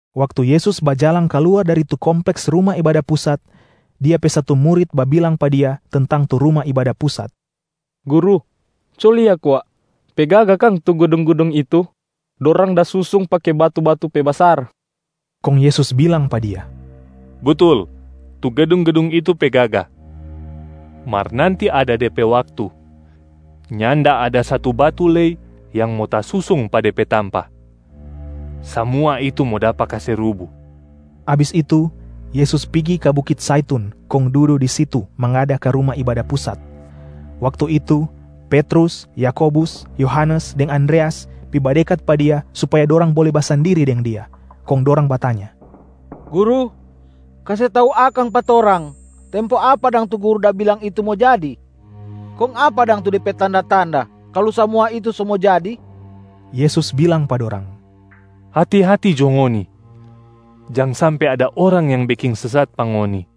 Waktu Yesus bajalang kaluar dari tu kompleks Ruma Ibada Pusat, Dia pe satu murit babilang pa Dia tentang tu Ruma Ibada Pusat, “Guru, co lia kwa! Pe gaga kang tu gedung-gedung itu? Dorang da susung pake batu-batu pe basar.” Kong Yesus bilang pa dia, “Butul, tu gedung-gedung itu pe gaga. Mar nanti ada de pe waktu, nyanda ada satu batu lei yang mo tasusung pa de pe tampa, samua itu mo dapa kase rubu.” Abis itu, Yesus pigi ka bukit Zaitun kong dudu di situ mangada ka Ruma Ibada Pusat. Waktu itu Petrus, Yakobus, Yohanes deng Andreas pi badekat pa Dia supaya dorang bole basandiri deng Dia, kong dorang batanya, “Guru, kase tau akang pa torang, tempo apa dang tu Guru da bilang tadi itu mo jadi? Kong apa dang tu de pe tanda-tanda kalu samua itu so mo jadi?” Yesus bilang pa dorang, “Hati-hati jo ngoni, jang sampe ada orang yang beking sesat pa ngoni.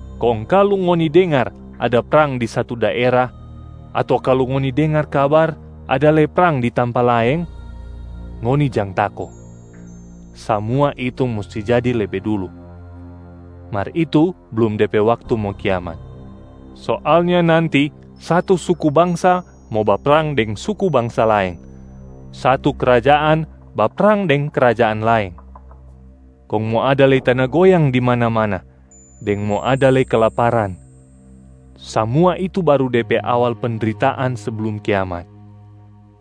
Kong kalu ngoni dengar ada prang di satu daera, ato kalu ngoni dengar kabar ada lei prang di tampa laeng, ngoni jang tako. Samua itu musti jadi lebe dulu, mar itu blum de pe waktu mo kiamat. Soalnya nanti satu suku bangsa mo baprang deng suku bangsa laeng, satu krajaan baprang deng krajaan laeng. Kong mo ada lei tana goyang di mana-mana deng mo ada lei kelaparan. Samua itu baru de pe awal pendritaan seblum kiamat,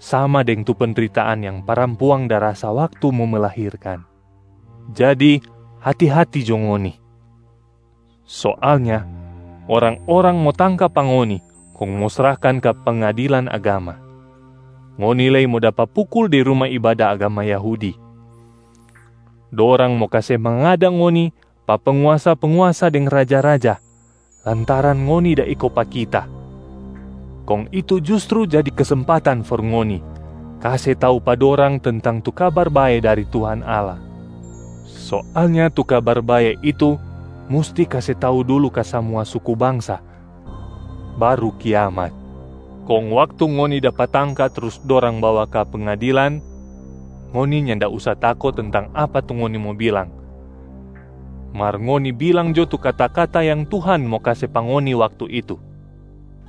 sama deng tu pendritaan yang parampuang da rasa waktu mo melahirkan. Jadi hati-hati jo ngoni! Soalnya orang-orang mo tangka pa ngoni kong mo srahkan ka pengadilan agama, ngoni lei mo dapa pukul di ruma ibada agama Yahudi. Dorang mo kase mangada ngoni pa penguasa-penguasa deng raja-raja lantaran ngoni da iko pa Kita, kong itu justru jadi kesempatan for ngoni kase tau pa dorang tentang tu Kabar Bae dari Tuhan Allah. Soalnya tu Kabar Bae itu musti kase tau dulu ka samua suku bangsa baru kiamat. Kong waktu ngoni dapa tangka trus dorang bawa ka pengadilan, ngoni nyanda usa tako tentang apa tu ngoni mo bilang. Mar ngoni bilang jo tu kata-kata yang Tuhan mo kase pa ngoni waktu itu,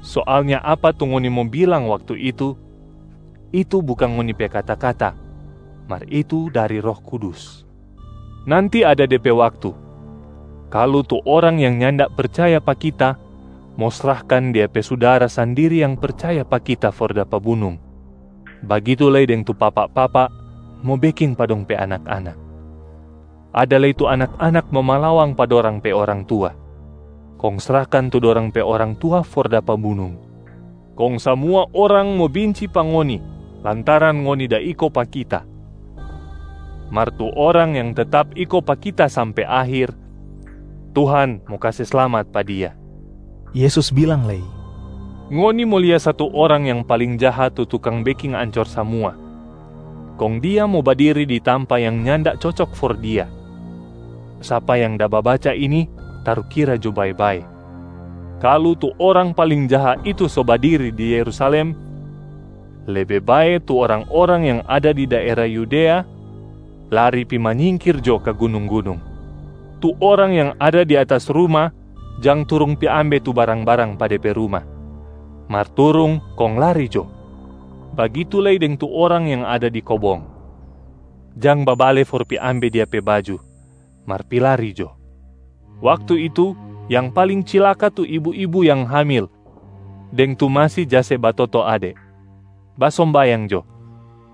soalnya apa tu ngoni mo bilang waktu itu, itu bukang ngoni pe kata-kata mar itu dari Roh Kudus. Nanti ada de pe waktu, kalu tu orang yang nyanda percaya pa Kita mo srahkan dia pe sudara sandiri yang percaya pa Kita for dapa bunung, bagitu lei deng tu papa-papa mo beking pa dong pe anak-anak. Ada lei tu anak-anak mo malawang pa dorang pe orang tua, kong srahkan tu dorang pe orang tua for dapa bunung. Kong samua orang mo binci pa ngoni lantaran ngoni da iko pa Kita. Mar tu orang yang tetap iko pa Kita sampe akhir, Tuhan mo kase slamat pa dia.” Yesus bilang lei, “Ngoni mo lia satu orang yang paling jaha tu tukang beking ancor samua, kong dia mo badiri di tampaa yang nyanda cocok for dia. (Sapa yang da babaca ini tarukira jo bae-bae!) Kalu tu orang paling jaha itu so badiri di Yerusalem, lebe bae tu orang-orang yang ada di daera Yudea lari pi manyingkir jo ka gunung-gunung. Tu orang yang ada di atas ruma jang turung pi ambe tu barang-barang pa de pe ruma, mar turung kong lari jo. Bagitu lei deng tu orang yang ada di kobong, jang babale for pi ambe dia pe baju, mar pi lari jo! Waktu itu yang paling cilaka tu ibu-ibu yang hamil deng tu masi ja se batoto ade. Basombayang jo,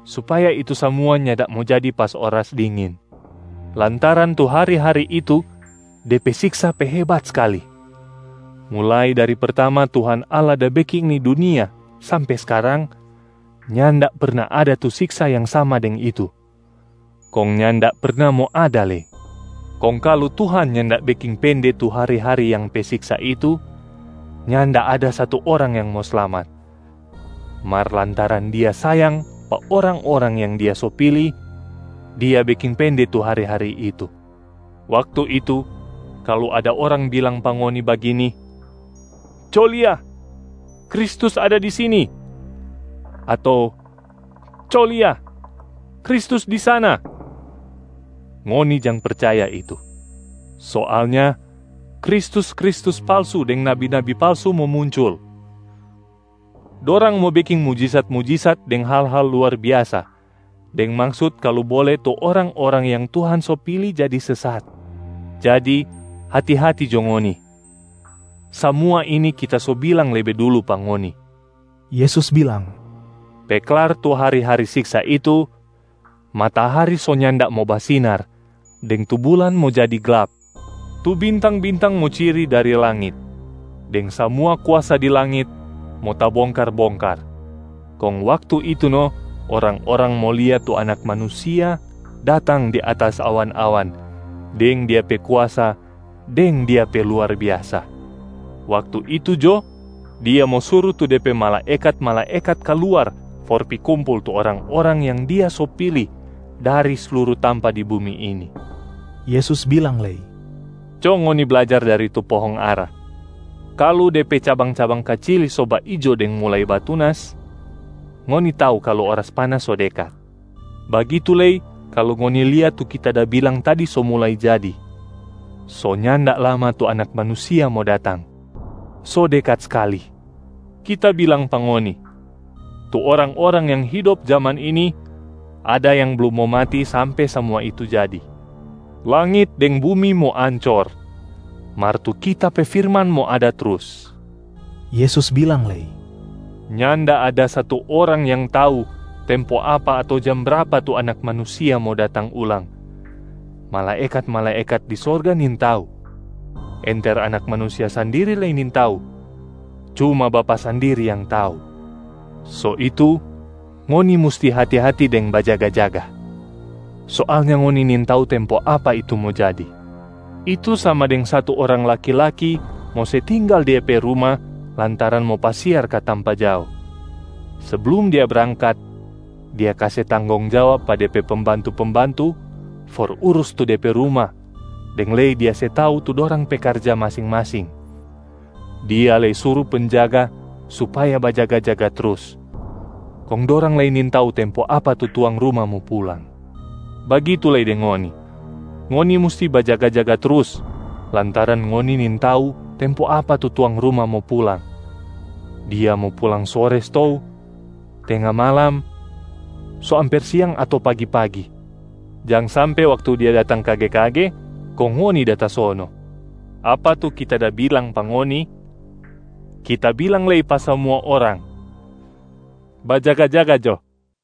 supaya itu samua nyanda mo jadi pas oras dingin, lantaran tu hari-hari itu de pe siksa pe hebat skali, mulai dari pertama Tuhan Allah da beking ni dunia sampe skarang, nyanda perna ada tu siksa yang sama deng itu, kong nyanda perna mo ada lei. Kong kalu Tuhan nyanda beking pende tu hari-hari yang pe siksa itu, nyanda ada satu orang yang mo slamat. Mar lantaran Dia sayang pa orang-orang yang Dia so pili, Dia beking pende tu hari-hari itu. Waktu itu, kalu ada orang bilang pa ngoni bagini, ‘Co lia, Kristus ada di sini!’ ato ‘Co lia, Kristus di sana!’, ngoni jang percaya itu. Soalnya kristus-kristus palsu deng nabi-nabi palsu mo muncul. Dorang mo beking mujisat-mujisat deng hal-hal luar biasa, deng maksut kalu bole tu orang-orang yang Tuhan so pili jadi sesat. Jadi hati-hati jo ngoni, samua ini Kita so bilang lebe dulu pa ngoni!” Yesus bilang, “Pe klar tu hari-hari siksa itu, ‘Matahari so nyanda mo basinar deng tu bulan mo jadi glap. Tu bintang-bintang mo ciri dari langit, deng samua kuasa di langit mo tabongkar-bongkar.’ Kong waktu itu no orang-orang mo lia tu Anak Manusia datang di atas awan-awan deng Dia pe kuasa deng Dia pe luar biasa. Waktu itu jo, Dia mo suru tu De pe malaekat-malaekat kaluar for pi kumpul tu orang-orang yang Dia so pili dari sluru tampa di bumi ini.” Yesus bilang lei, “Co ngoni blajar dari tu pohong ara. Kalu de pe cabang-cabang kacili so baijo deng mulai batunas, ngoni tau kalu oras panas so dekat. Bagitu lei kalu ngoni lia tu Kita da bilang tadi so mulai jadi, so nyanda lama tu Anak Manusia mo datang, so dekat skali. Kita bilang pa ngoni, tu orang-orang yang hidop jaman ini ada yang blum mo mati sampe samua itu jadi. Langit deng bumi mo ancor, mar tu Kita pe firman mo ada trus.” Yesus bilang lei, “Nyanda ada satu orang yang tau tempo apa ato jam brapa tu Anak Manusia mo datang ulang. Malaekat-malaekat di sorga nintau, enter Anak Manusia sandiri lei nintau, cuma Bapa sandiri yang tau. So itu ngoni musti hati-hati deng bajaga-jaga! Soalnya ngoni nintau tempo apa itu mo jadi. Itu sama deng satu orang laki-laki mo se tinggal dia pe ruma lantaran mo pasiar ka tampa jao. Seblum dia brangkat, dia kase tanggong jawab pa de pe pembantu-pembantu for urus tu de pe ruma deng lei dia se tau tu dorang pe karja masing-masing. Dia lei suru penjaga supaya bajaga-jaga trus, kong dorang lei nintau tempo apa tu tuang ruma mo pulang. Bagitu lei deng ngoni, ngoni musti bajaga-jaga trus lantaran ngoni nintau tempo apa tu tuang ruma mo pulang. Dia mo pulang sore stou, tenga malam, so amper siang ato pagi-pagi. Jang sampe waktu dia datang kage-kage, kong ngoni da tasono. Apa tu Kita da bilang pa ngoni, Kita bilang lei pa samua orang: bajaga-jaga jo!”